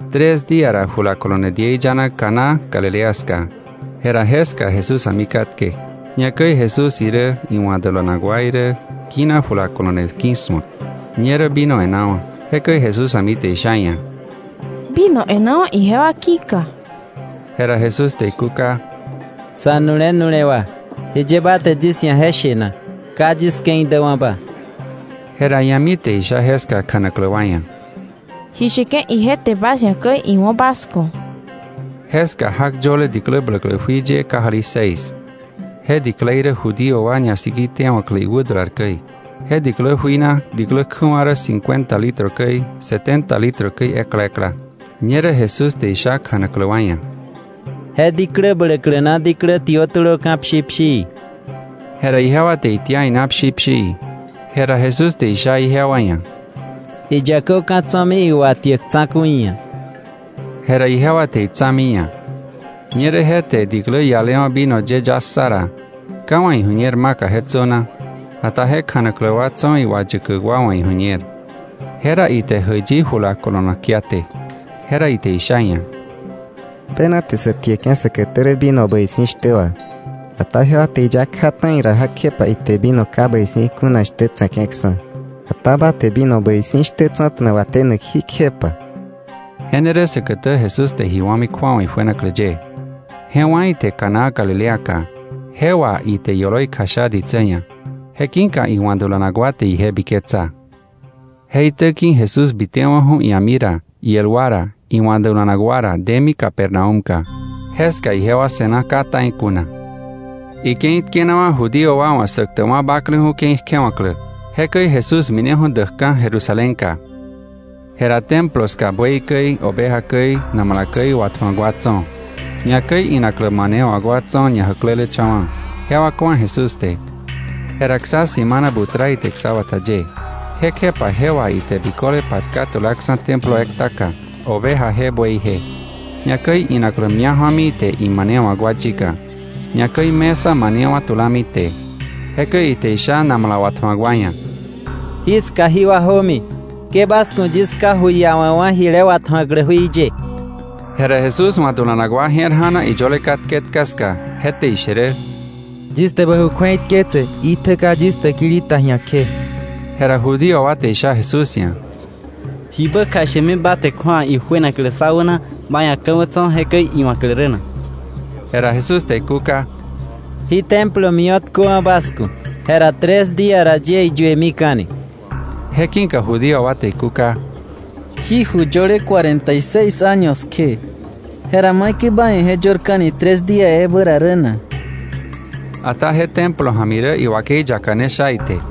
Tres día ra jula kolone diei yana Caná Galilea ska. Jera jeska Jesús a̱mi katke. Ñakäi Jesús irä iwa̱ dulanak wa irä kina jula kolone ki̱su̱ak. Ñerä vino e̱nawa̱. Jekäi Jesús a̱mi te isha iia̱: —Vino e̱nawa̱ ijewa ki̱ka. Jera Jesús te ikúka: —Sa̱nu̱le nu̱lewa, ¿jiye ba te yis ia̱ je she na? Ka yis ke̱i däwa̱ba. Jera ia̱mi te isha jeska kjanaklä wa ia̱: —Ji sheke̱ ije te bas ia̱ käi, iwo̱ bas ku̱. Jeska jak yöle diklä bläklä jui ye kajali seis. Je diklei rä Judío wa ñasikitewa̱klä iwädular käi. Je diklä jui na diklä kjäwa̱ rä cincuenta litro käi, setenta litro käi ekla ekla. Ñerä Jesús te isha kjanaklä wa ia̱: —Je diklä bläklä na diklä tiö tulöka̱ pshi pshii. Jera ijewa te itia ina pshi pshii. Jera Jesús te isha ijewa ia̱: —Iyäköka̱ tso̱mi iwatiäk tsa̱ku̱i ia̱. Jera ijewa te itsa̱mi iia̱. Ñerä je te diklä ialewa̱ vino ye ya ssa ra, ka iwa̱ iju̱ñer maka je tsöna, ata kjanaklä wa tso̱ iwayäkäk wa wa̱ iju̱ñer. Jera ite jäiyi jula kolonak kiaté. Jera ite isha iia̱: —Bena te sä tieke̱ säkätä rä vino bäi si̱ shtä wà, ata ijewa te iya kja ta̱i ra, jekjepa ite vino ka bäi si̱ kuna shtä tse̱ke̱ksa̱. Ata ba te vino bäi si̱ shtä tsa̱ta̱na watenak jí kjepa. Je ne rä säkätä Jesús te ji wa̱mi kju̱awa ijuenaklä ye. Je wá̱ ite Caná Galileaka. Je wà ite ioloi kjasha ditsä ia̱. Je ki̱ka iwa̱ dulanak wa te ije biketsa. Je itä ki̱ Jesús bitewa̱ju̱ ia̱mi ra, iel wa ra, iwa̱ dulanak wa ra, demi Capernaúmka. Jeska ijewa se̱na ka ta̱i kuna. Ike̱i tkenawa̱ Judío wa wa̱ Säktäkwa̱ Bakleju̱ ke̱i kjewa̱klä. Jekäi Jesús mineju̱ däkka̱ Jerusalénka. Jera Templo ska buey käi, oveja käi, namala käi watju̱ak wa tso̱, ñakäi inaklä manewa̱k wa tso̱ ñajäklelecha̱wa̱, jewa ku̱a Jesús te. Jera ksa simana butra ite ksabata ye. Jekjepa je wà ite biköle patka tulaksa̱ Templo ektaka, ovejaje, bueyje; ñakäi inaklä mia̱ ju̱ami ite imanewa̱k wa yika, ñakäi mesa manewa̱ tulami ite. Jekäi ite isha namala watju̱ak wa ia̱: —Jiska jí wa jömi, ke bas ku̱ yis Ká ju iawa̱ wa̱ jile watju̱aklä jui ye. Jera Jesús wa̱ dulanak wa je̱r ja̱na iyöle katke etka ska, je te ishe rä: “Yis te bä ju kju̱eitketse itjä ka yis täkili ta ji̱a kje.” Jera Judío wa te isha Jesús ia̱: —¿Jibä kjashemi ba te kju̱awa ijuenaklä sá wäna ba ia̱ ka̱wä tso̱ jekäi iwa̱klä rä na? Jera Jesús te ikúka: —Jí Templo mio̱tköwa̱ bas ku̱, jera tres día ra yie iyuemika̱ni. Je ki̱ka Judío wa te ikúka: —Jí ju yöle cuarenta y seis año kje, jera ¿maikäi ba ia̱ je yörmika̱ni tres día ebä ra rä na? Ata je Templo ja̱mi rä iwakei yaka ne sha ite.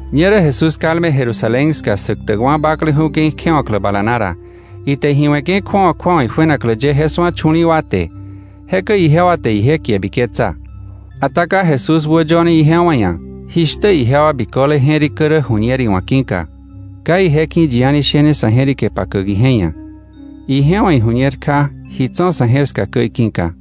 Ñerä Jesús kalme Jerusalén ska Säktäkwa̱ Bakleju̱ ke̱i kjewa̱klä bala na ra, ite ji we̱ke̱ kju̱awa kju̱awa ijuenaklä ye je su̱a chu̱li̱i̱ wa te. Jekäi ijewa te ije kie biketsa. Ata ka Jesús wäyöne ijewa ia̱, jishtä ijewa biköle je̱rikä rä ju̱ñer iwa̱ ki̱ka. Ka ije ki̱ yi a̱ni shene sa̱ je̱rike pakäk ije ia̱, ije wa̱ iju̱ñer kja ji tso̱ sa̱ je̱r ska käi ki̱ka.